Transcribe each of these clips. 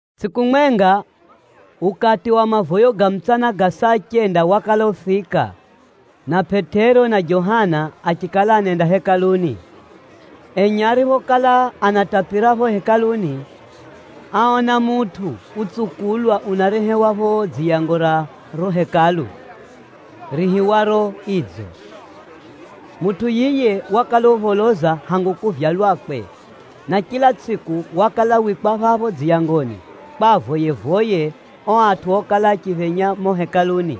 Tsʼiku mwenga, ukati wa mavoyo ga mutsana ga saa chenda wakala ufika, na Pʼetero na Johana achikala anenda Hekaluni. Enye ariphokala anatapira pho Hekaluni, áona mutʼu utsukulwa unarehewa pho dziyango ra riro Hekalu, riihiwaro “Idzo.” Mutʼu yiye wakala upholoza hangu kuvyalwakwe, na chila tsʼiku wakala wikwa phapho dziyangoni, kwa avoye-voye o atʼu okala achiphenya mumo Hekaluni.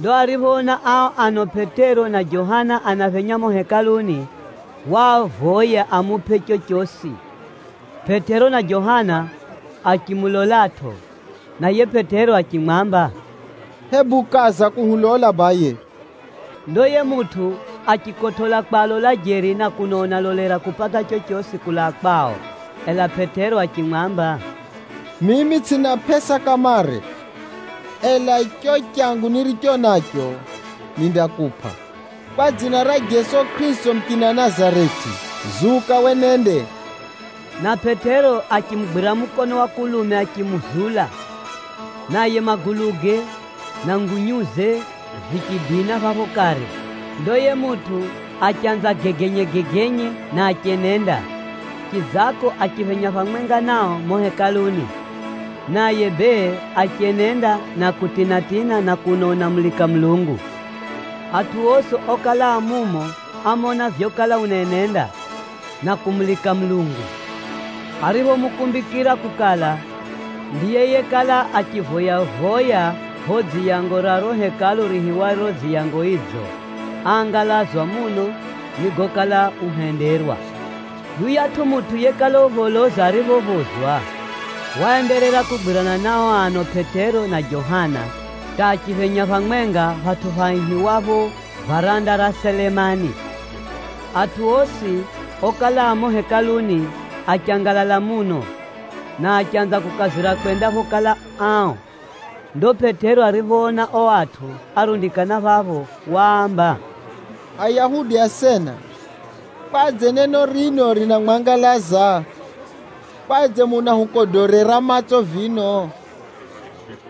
Ndo ariphoona ao ano Pʼetero na Johana anaphenya mumo Hekaluni, waavoya amupʼe chochosi. Pʼetero na Johana achimulolatʼo, na yiye Pʼetero achimwamba, “Hebu kaza kuhulola baye.” Ndo yiye mutʼu achikotʼola kwalola jeri na kuno unalolera kupata chochosi kulaa kwao. Ela Pʼetero achimwamba, “Mimi tsʼina pʼesa kamare, ela cho changu niricho nacho, nindakupʼa. Kwa dzina ra Jeso Kʼirisito muchina Nazareti, zuka wenende!” Na Pʼetero achimugwira mukono wa kulume achimuzula, naye maguluge na ngunyuze vichidina phapho kare. Ndo yiye mutʼu achanza gegenyegegenye na achenenda. Chidzako achiphenya phamwenga nao mumo Hekaluni, naye bee achenenda na kutina-tina na kuno unamulika Mulungu. Atʼu osi okala a mumo ámona vyokala unaenenda, na kumulika Mulungu. Ariphomukumbikira kukala, ndiye yekala achivoya-voya pho dziyango ra riro Hekalu riihiwaro Dziyango Idzo, áangalazwa muno ni gokala uhenderwa. Yuyatʼu mutʼu yekala upholoza ariphophozwa, waenderera kugwirana na o ano Pʼetero na Johana hata achiphenya phamwenga phatʼu phaihiwapho, Varanda ra Selemani. Atʼu osi okala a mumo Hekaluni, achangalala muno, na achanza kukazira kwenda phokala ao. Ndo Pʼetero ariphoona o atʼu árundikana phapho, waamba, “Ayahudi asena, kwadze neno rino rinamwangalaza? Kwadze munahukodorera matso vino?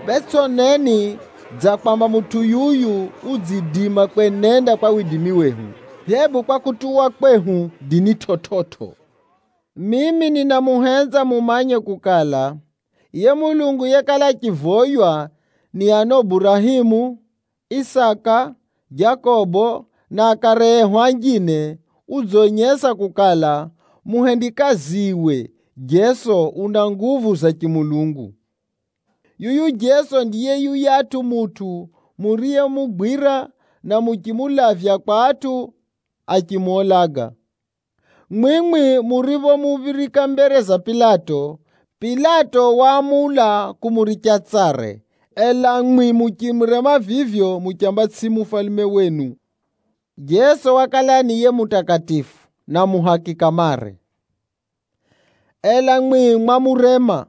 Bee, tsʼoneni dza kwamba mutʼu yuyu udziidima kwenenda kwa widimi wehu, hebu kwa kutuwa kwehu dini chividzo! Mimi ninamuhenza mumanye kukala, yiye Mulungu yekala achivoywa ni ano Burahemu, Isaka, Jakobo na akare ehu anjine, udzonyesa kukala, muhendikaziwe Jeso una nguvu za chimulungu. Yuyu Jeso ndiye yuyatʼu mutʼu muriyemugwira, na muchimulavya kwa atʼu achimuulaga. Mwimwi muriphomuphirika mbere za Pilato, Pilato waamula kumuricha tsare, ela mwimwi muchimurema vivyo muchamba tsʼiye mufalume wenu. Jeso wakala ni yiye mutakatifu, na muhaki kamare. Ela mwi mwamurema,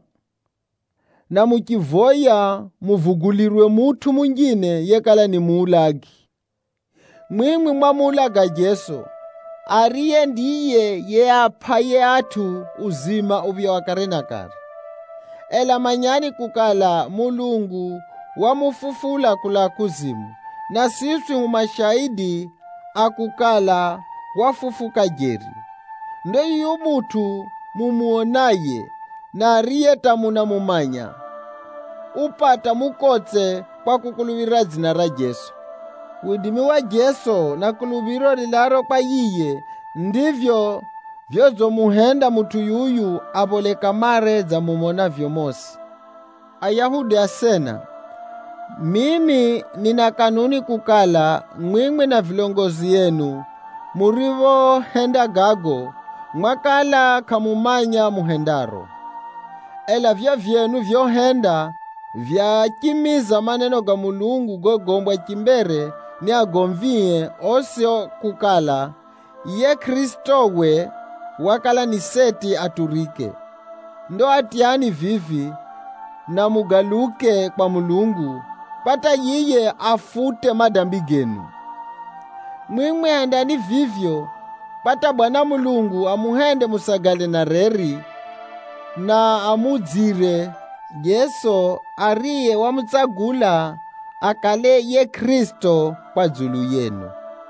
na muchivoya muvugulirwe mutʼu munjine yekala ni muulagi. Mwimwi mwamuulaga Jeso, ariye ndiye yiye aapʼaye atʼu uzima uphya wa kare na kare. Ela manyani kukala, Mulungu wamufufula kulaa kuzimu, na siswi hu mashaidi a kukala, wafufuka jeri. Ndo yuyu mutʼu mumonaye, na ariye hata munamumanya, upata mukotse kwa kukuluphira dzina ra Jeso. Widimi wa Jeso, na kuluphiro rilaaro kwa yiye ndivyo vyodzimuhenda mutʼu yuyu aphole kamare dza mumonavyo mosi. “Ayahudi asena, mimi nina kanuni kukala, mwimwi na vilongozi enu muriphohenda gago, mwakala kʼamumanya muhendaro. Ela vivyo vyenu vyohenda, vyachimiza maneno ga Mulungu gogombwa chimbere ni agomvie osi kukala, yiye Kʼirisitowe wakala ni seti aturike. Ndo atyani vivi, na mugaluke kwa Mulungu, kwa hata yiye afute madambi genu. Mwimwi hendani vivyo, kwa hata Bwana Mulungu amuhende musagale na reri, na amuudzire Jeso, ariye wamutsagula akale yiye Kʼirisito kwa dzulu yenu.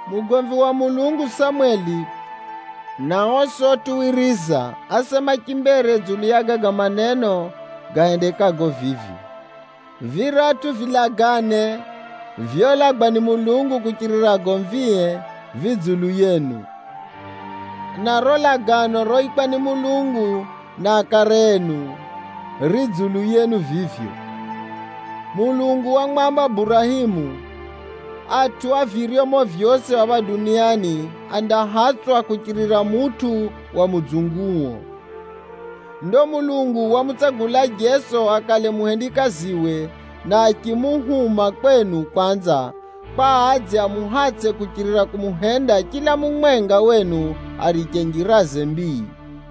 “Mugomvi wa Mulungu Samweli na osi otuwiriza, ásema chimbere dzulu ya gaga maneno gahendekago vivi. Viratʼu vilagane vyolagwa ni Mulungu kuchirira agomvie, vi dzulu yenu. Na riro lagano roikwa ni Mulungu na akare enu, ri dzulu yenu vivyo. Mulungu wamwamba Burahemu, ‘Atʼu a viryomo vyosi phapha duniani, andahatsʼwa kuchirira mutʼu wa mudzunguo.’ Ndo Mulungu wamutsagula Jeso akale muhendikaziwe, na achimuhuma kwenu kwanza, kwa adze amuhatsʼe kuchirira kumuhenda chila mumwenga wenu ariche njiraze mbii.”